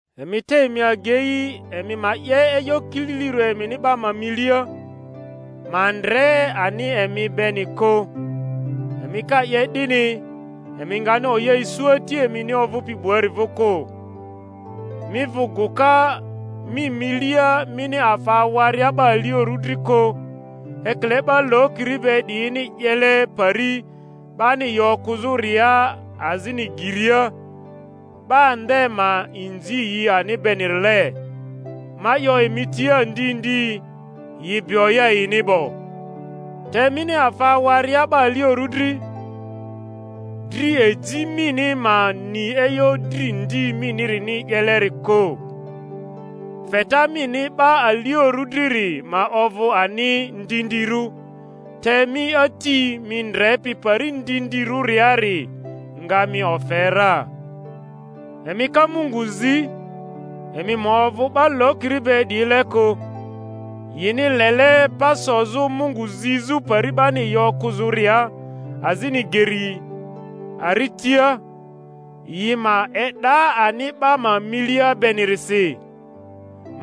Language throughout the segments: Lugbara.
Emi te emi agei emi ma 'ye e'yo kililirᴜ emini 'ba ma milia, ma ndre ani emi beni kᴜ; emi ka 'ye 'dini, emi ngani oya isu Ati emini ovᴜpi 'buari vᴜ kᴜ. Mi vᴜ gᴜka mi milia mini afa awaria 'ba aliorᴜ dri kᴜ, ekile 'ba lokiri be 'diyini 'yele pari 'bani yi okᴜzᴜria azini geria, 'ba nde ma inzi yi ani benirile. Ma 'yo emi tia ndi ndi, yi bi oya yini 'bo. Te mini afa awaria 'ba aliorᴜ dri, dri eji mini ma ni e'yo dri ndi minirini 'yeleri kᴜ, feta mini 'ba aliorᴜ driri ma ovᴜ ani ndindirᴜ; te mi Ati mi ndrepi pari ndindirᴜriari nga mi ofe ra. Emi ka Mungu zi, emi ma ovᴜ 'ba lokiri be 'diyile kᴜ; yini lele pa sozᴜ Mungu zizᴜ pari 'bani yi okᴜzᴜria azini geri aritia, yi ma e'da ani 'ba ma milia benirisi.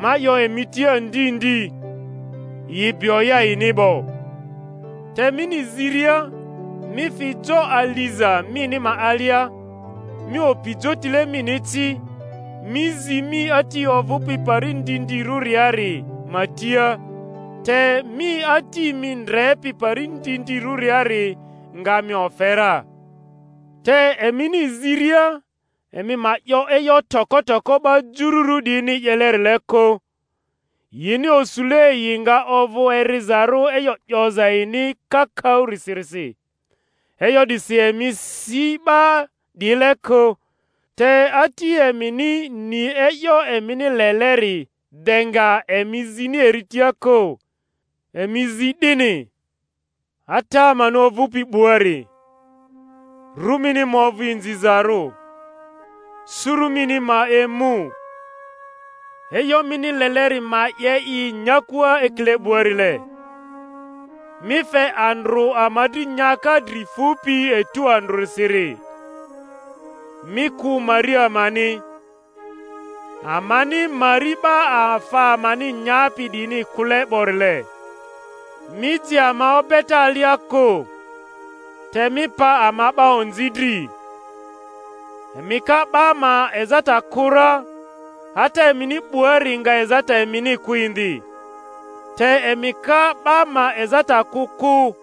Ma 'yo emi tia ndi ndi, yi bi oya yini 'bo. Te mini ziria, mi fi jo aliza mini ma alia, mi opi jotile mini ci, mi zi mi Ati ovᴜpi pari ndindirᴜriari ma tia, te mi Ati mi ndrepi pari ndindirᴜriari nga mi ofe ra. Te emini ziria emi ma 'yo e'yo toko toko 'ba jururᴜ 'diyini 'yelerile kᴜ; yini osule yi nga ovᴜ erizarᴜ e'yo 'yoza yini kakaᴜsirisi. E'yo 'disi emi si 'ba 'diyile kᴜ, te Ati emini ni e'yo emini leleri de nga emi zini eri tia kᴜ. Emi zi 'dini: Ata amani ovᴜpi 'buari, Ru mini ma ovᴜ inzizarᴜ. Suru mini ma emu, E'yo mini leleri ma 'ye i Nyakua ekile 'buarile. Mi fe andrᴜ ama dri nyaka dri fupi etu andrᴜsiri; Mi kᴜ mari amani, Amani mari 'ba afa amani nyapi 'diyini kᴜle 'borile; Mi ji ama obeta alia kᴜ, Te mi pa ama 'ba onzi dri. Emi ka 'ba ma ezata kᴜ ra, Ata emini 'buari nga ezata emini kᴜ indi; te emi ka 'ba ma ezata kᴜ kᴜ,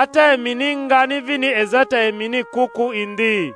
Ata emini ngani vini ezata emini kᴜ kᴜ indi.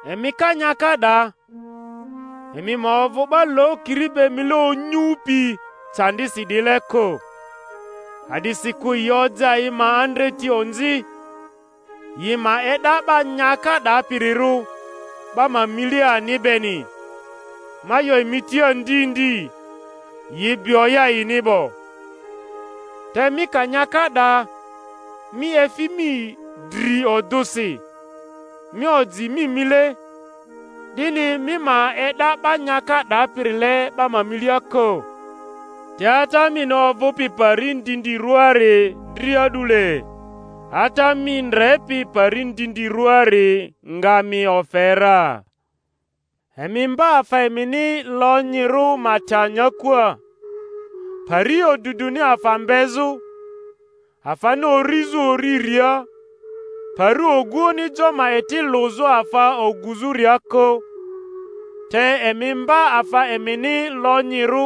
Emi ka nyaka 'da, emi ma ovᴜ 'ba lokiri be mile onyupi candisi 'diyile kᴜ, a'disikᴜ yi oja yi ma andreti onzi, yi ma e'da 'ba nyaka 'dapirirᴜ 'ba ma milia ani beni. Ma 'yo emi tia ndi ndi, yi bi oya yini 'bo. Te mi ka nyaka 'da, mi efi mi dri odᴜsi, mi oji mi mile, 'dini mi ma e'da 'ba nyaka 'dapirile 'ba ma milia kᴜ, te Ata mini ovᴜpi pari ndindirᴜari dri a'dule; Ata mi ndrepi pari ndindirᴜari nga mi ofe ra. Emi mba afa emini lonyirᴜ ma ta nyakua, pari oduduni afa mbezᴜ, afani urizᴜ uriria, pari oguoᴜni jo ma eti lᴜzᴜ afa oguzᴜria kᴜ, te emi mba afa emini lonyirᴜ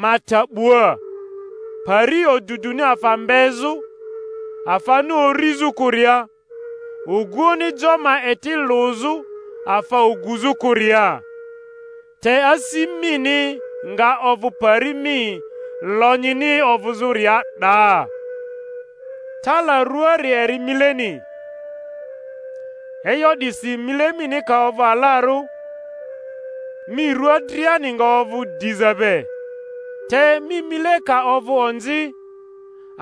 ma ta 'bua, pari oduduni afa mbezᴜ, afani urizᴜ kᴜria, oguoᴜni jo ma eti lᴜzᴜ afa oguzᴜ kᴜria. Te asi mini nga ovᴜ pari mi lonyini ovᴜzᴜria 'daa. Tala ruaari eri mileni. E'yo 'disi mile mini ka ovᴜ alarᴜ, mi rua driani nga ovᴜ diza be; te mi mile ka ovᴜ onzi,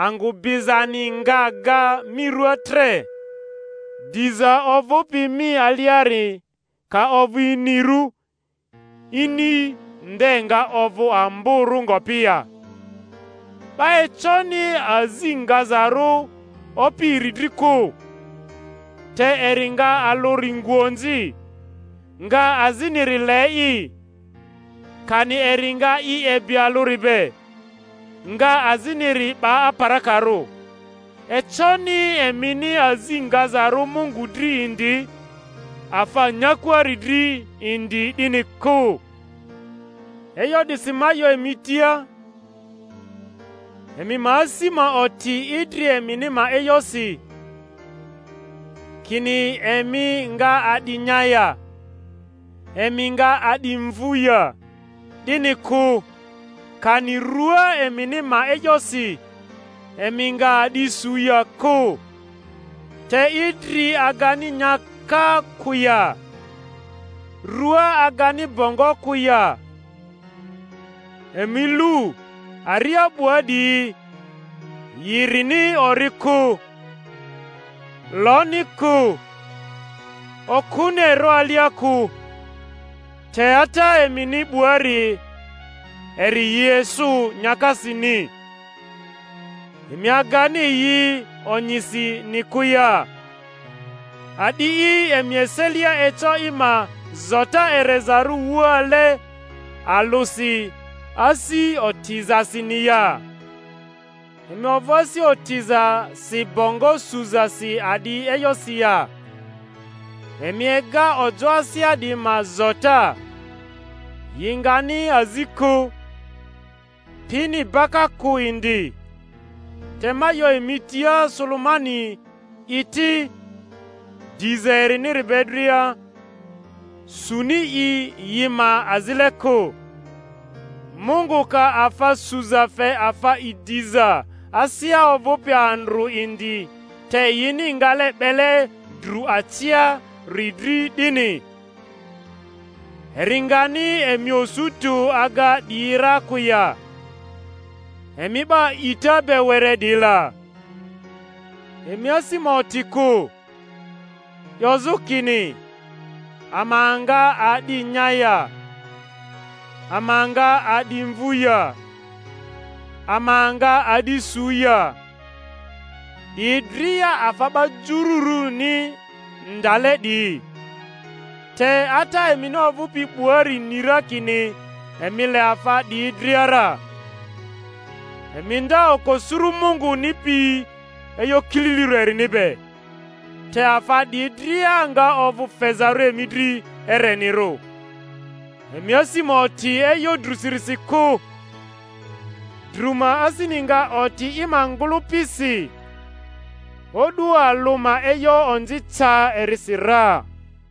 angᴜ bizani nga ga mi ruaa tre. Diza ovᴜpi mi aliari ka ovᴜ inirᴜ, ini nde nga ovᴜ amborᴜ ngopi ya 'Ba econi azi ngazarᴜ opi iri dri kᴜ; te eri nga alᴜri ngu onzi, nga aziniri le'i, kani eri nga i ebi alᴜri be, nga aziniri 'ba aparakarᴜ. Econi emini azi ngazarᴜ Mungu dri indi, afa nyakuari dri indi, 'dini kᴜ. E'yo 'disi ma 'yo emi tia, emi ma asi ma oti idri emini ma e'yosi, kini emi nga a'di nya ya, emi nga a'di mvu ya, 'dini kᴜ; kani rua emini ma e'yosi, emi nga a'di su ya kᴜ. Te idri agani nyaka kᴜ ya? Rua agani bongo kᴜ ya? Emi lu aria 'bua 'diyi: yi rini ori kᴜ, loni kᴜ, okᴜni ero alia kᴜ, te Ata emini 'buari eri yi esᴜ nyakasini. Emi agani yi onyisini kᴜ ya? A'di'i emi eselia eco i ma zota erezarᴜ wuale alᴜsi asi otizasini ya? Emi ovᴜ asi otizasi bongo suzasi a'di e'yosi ya? Emi ega ojo asea 'diyi ma zota; yi ngani azi kᴜ, pini baka kᴜ indi; te ma 'yo emi tia, Sulemani'i ti, diza eriniri be dria, suni i yi ma azile kᴜ. Mungu ka afa suza fe afa idiza asea ovᴜpi andrᴜ indi te yini ngale 'bele dru aciari dri 'dini, eri ngani emi osu tᴜ aga 'diyi ra kᴜ ya, emi 'ba a'ita be were 'diyi la? Emi asi ma oti kᴜ, 'yozᴜ kini, Ama nga a'di nya ya? Ama nga a'di mvᴜ ya? Ama nga a'di su ya? 'Diyi dria afa 'ba juruni ndale 'diyi; te Ata emini ovᴜpi 'buari ni ra kini emi le afa 'diyi dria ra. Emi nda oko suru Munguni pi e'yo kililirᴜ erini be, te afa 'diyi dria nga ovᴜ fezarᴜ emi dri erenirᴜ. Emi asi ma oti e'yo drᴜsirisi kᴜ; drᴜ ma asini nga oti i ma ngᴜlᴜpisi. O'du alᴜ ma e'yo onzi ca erisi ra.